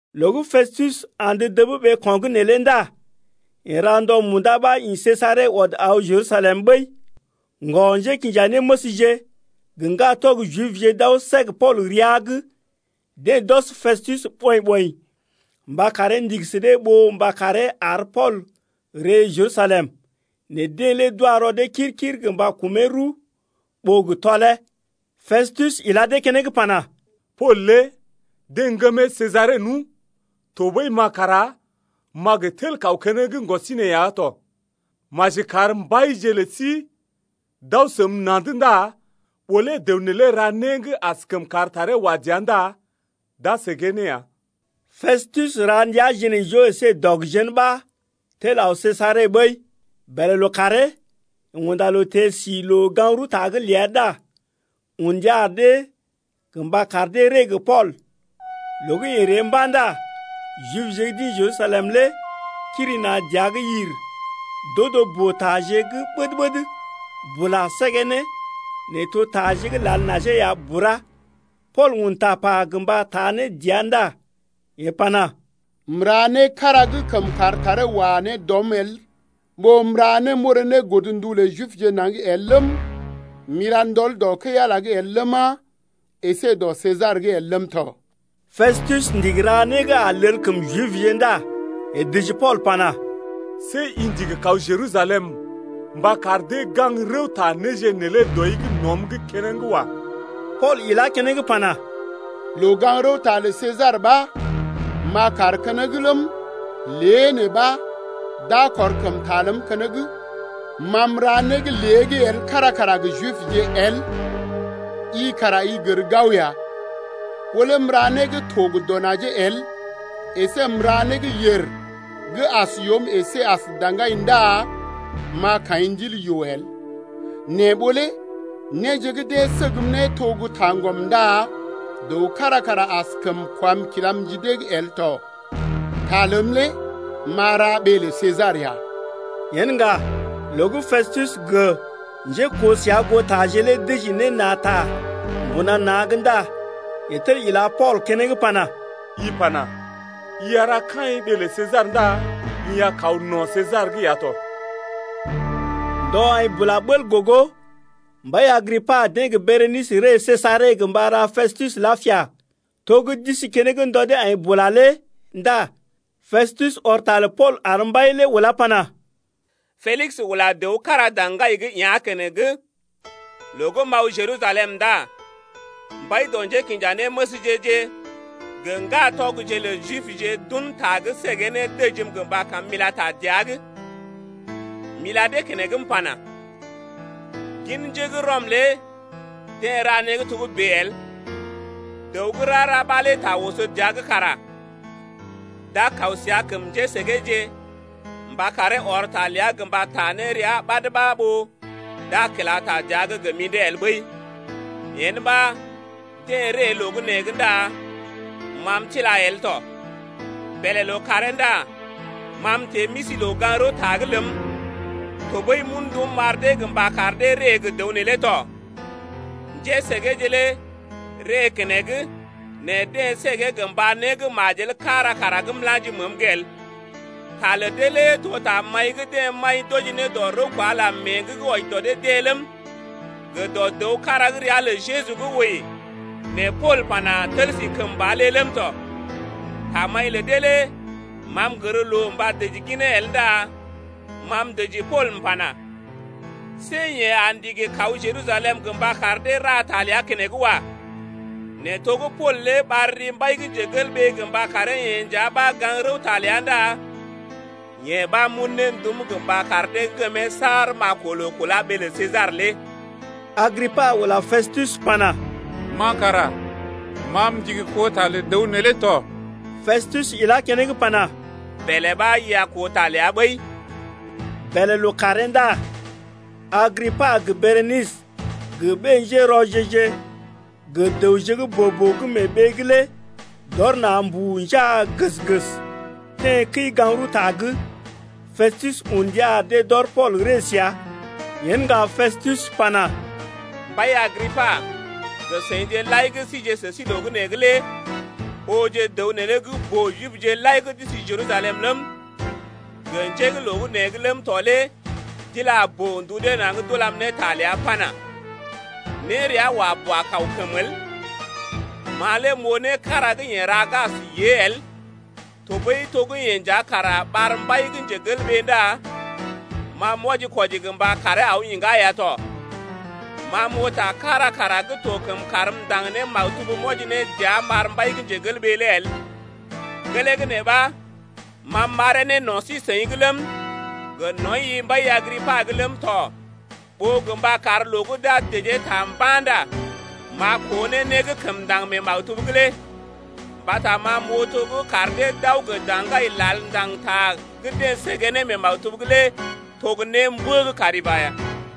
Loo gə́ Pestus andə dəb ɓeeko̰’g neelé ndá yeḛ ra ndɔ munda ɓa ḭ Sejare ɔd aw Jerusalem ɓəi. Ŋgɔ-njékinjanéməsje gə ŋgatɔg Jibje d’aw səg Pool rəa’g. Deḛ d’ɔs Pestus ɓɔḭ-ɓɔḭ mba karee ndigi sə dee ɓó mba karee ar Pool ree Jerusalem. Nɛ deḛ lé d’wa rɔ dee kir-kir gə mba kumee rəw ɓó gə tɔlee. Pestus ila dee keneŋ pana: Pool lé deḛ ŋgəmee Sejare nu, tɔɓəi ma kara m’a gə tel kaw keneŋ ɓasinè ya tɔ. Maji kar mbaije lə sí d’aw səm na̰’d ndá ɓó lé dəw neelé ra né gə́ askəm kar taree wa dəa ndá d’a səgee ne ya. Pestus ra ndəa jinaijoo əsé dɔg jén ɓa tel aw Sejare ɓəi. Bèlè lookàree yeḛ unda loo teḛ si loo-gaŋg-rəwta’g ləa ndá un ndia ar dee gə mba kar dee ree gə Pool. Loo gə́ yeḛ ree mba̰ ndá Jibje gə́ d’ḭ Jerusalem lé kiri na̰ dəa’g yir d’odo boo-taje gə́ ɓəd-ɓəd bula səgee ne nɛ to taje gə́ lal najee ya bura. Pool un tapa gə mba taa ne dɔ rəa ndá yeḛ pana: M’ra né kára gə́ kəm kar taree wa ne dɔm el ɓó m’ra né m’orè ne godndu lə Jibje naŋg el ləm, m’ila ndɔl dɔ kəi-Ala’g el ləma, əsé gə dɔ Sesar’g el ləm tɔ. Pestus ndigi ra né gə́ a lel kəm Jibje ndá yeḛ dəji Pool pana: See i ndigi kaw Jerusalem mba kar dee gaŋg rəwta néje neelé dɔi’g nɔm’g keneŋ wa. Pool ilá keneŋ pana: Loo-gaŋg-rəwta lə Sesar ɓa m’a kaar keneŋ ləm, lée nee ɓa d’a kɔr kəm ta ləm keneŋ. Ma m’ra né gə́ lée’g el kára kara gə Jibje el, i kara i gər gao ya. Ɓó lé m’ra né gə́ to gə dɔ najee el əsé m’ra né gə́ yèr gə́ as yoom əsé as daŋgai ndá m’a kaḭ ndil yoo el. Nɛ ɓó lé néje gə́ deḛ səgm ne to gə́ taŋgɔm ndá dəw kára kara askəm kwam kilam ji dee’g el tɔ. Ta ləm lé m’a ra ɓee lə Sesar ya. Yen ŋga loo gə́ Pestus gə njékoo səa goo taje lé dəji ne na̰ ta mbuna na̰’g ndá yeḛ tel ila Pool keneŋ pana: I pana: I a ra kaḭ ɓee lə Sesar ndá i a kaw no̰ Sesar’g ya tɔ. Ndɔ aḭ bula bəl gogo, mbai Agripa deḛ gə́ Berenisə ree Sejare gə mba ra Pestus lapia. To gə́ d’isi keneŋ ndɔ dee aḭ bula lé ndá Pestus ɔr ta lə Pool ar mbai lé ulá ne pana: Pelis ula dəw kára daŋgai’g yá̰ keneŋ. Loo gə́ m’aw Jerusalem ndá mbai dɔ njékinjanéməsje-je gə ŋgatɔgje lə Jibje d’un ta gə́ səgee ne dəjim gə mba kam m’ila ta dəa’g. M’ila dee keneŋ m’pana: Gin njé gə́ Rɔm lé deḛ ra né gə́ togə́bè el. Dəw gə́ rara ɓa lé ta oso dəa’g kara d’a kaw səa kəm njésəgeeje mba karee ɔr ta ləa gə mba taa ne rəa ɓad ɓa ɓó d’a kila ta dəa’g gə mḭdé el ɓəi. Yen ɓa deḛ ree loo gə́ nee’g ndá ma m’tila el tɔ. Bèlè lookàree ndá ma m’teḛ m’isi loo-gaŋg-rəwta’g ləm, tɔɓəi m’un ndum m’ar dee gə mba kar dee ree gə dəw neelé tɔ. Njésəgeeje lé ree keneŋ nɛ deḛ səgee gə mba né gə́ majel kára kara gə́ m’la̰ji məəm’g el. Ta lə dee lé to tamaḭ gə́ deḛ maḭ d’wɔji ne dɔ rəw kwa Ala mee’g gə́ wɔji dɔ dee-deḛ ləm, gə dɔ dəw kára gə́ ria lə Jeju gə́ wəi nɛ Pool pana: Tel si kəmba lé ləm tɔ. Tamaḭ lə dee lé ma m’gər loo mba dəji ginee el ndá ma m’dəji Pool m’pana: See yeḛ a ndigi kaw Jerusalem gə mba kar dee ra ta ləa keneŋ wa. Nɛ to gə́ Pool lé ɓar ri mbai gə mba karee-yeḛ nja ɓa gaŋg rəwta ləa ndá yee ɓa m’un ne ndum gə mba kar dee ŋgəm saar m’a koo loo kulá ɓee lə Sesar lé. Agripa ula Pestus pana: Ma kara ma m’ndigi koo ta lə dəw neelé tɔ. Pestus ilá keneŋ pana: Bèlè ɓa i a koo ta ləa ɓəi. Bèlè lookàree ndá Agripa gə Berenisə gə ɓé-njérɔje-je gə dəwje gə́ boo-boo gə́ mee ɓee’g lé d’ɔr na̰ mbuu njaa gəs-gəs teḛ kəi-gaŋg-rəwta’g. Pestus un ndia ar dee d’ɔr Pool ree səa. Yen ŋga Pestus pana: Mbai Agripa gə seḭje lai gə́ síje sə sí loo gə́ nee’g lé ooje dəw neelé gə́ boo-Jipje lai deḛ d’isi Jerusalem ləm, gə njé gə́ loo gə́ nee’g ləm tɔ lé d’ila boo-ndu dee naŋg d’ulam ne ta ləa pana: Nérea wa bua kaw kəmə el. Ma lé m’oo né kára gə́ yeḛ ra gə́ as yée el tɔɓəi to gə́ yeḛ nja kara ɓar mbai ndá ma m’wɔji-kwɔji gə mba karee aw iŋgá ya tɔ. Ma m’oo ta kára kara gə́ to kəm karm m’ndaŋg ne maktub m’wɔji ne dəa m’ar mbai lé el. Gelee gə́ nee ɓa ma m’ɓaree ne no̰ sí-seḭ’g ləm, gə nɔḭ-i mbai Agripa’g ləm tɔ ɓó gə mba kar loo gə́ d’a dəjee ta mba̰ ndá m’a koo ne né gə́ kəm ndaŋg mee maktub’g lé. Mbata ma m’oo to gə́ kar dee d’aw gə daŋgai lal ndaŋg ta gə́ deḛ səgee ne mee maktub’g lé to gə́ némbə gə́ kari ba ya.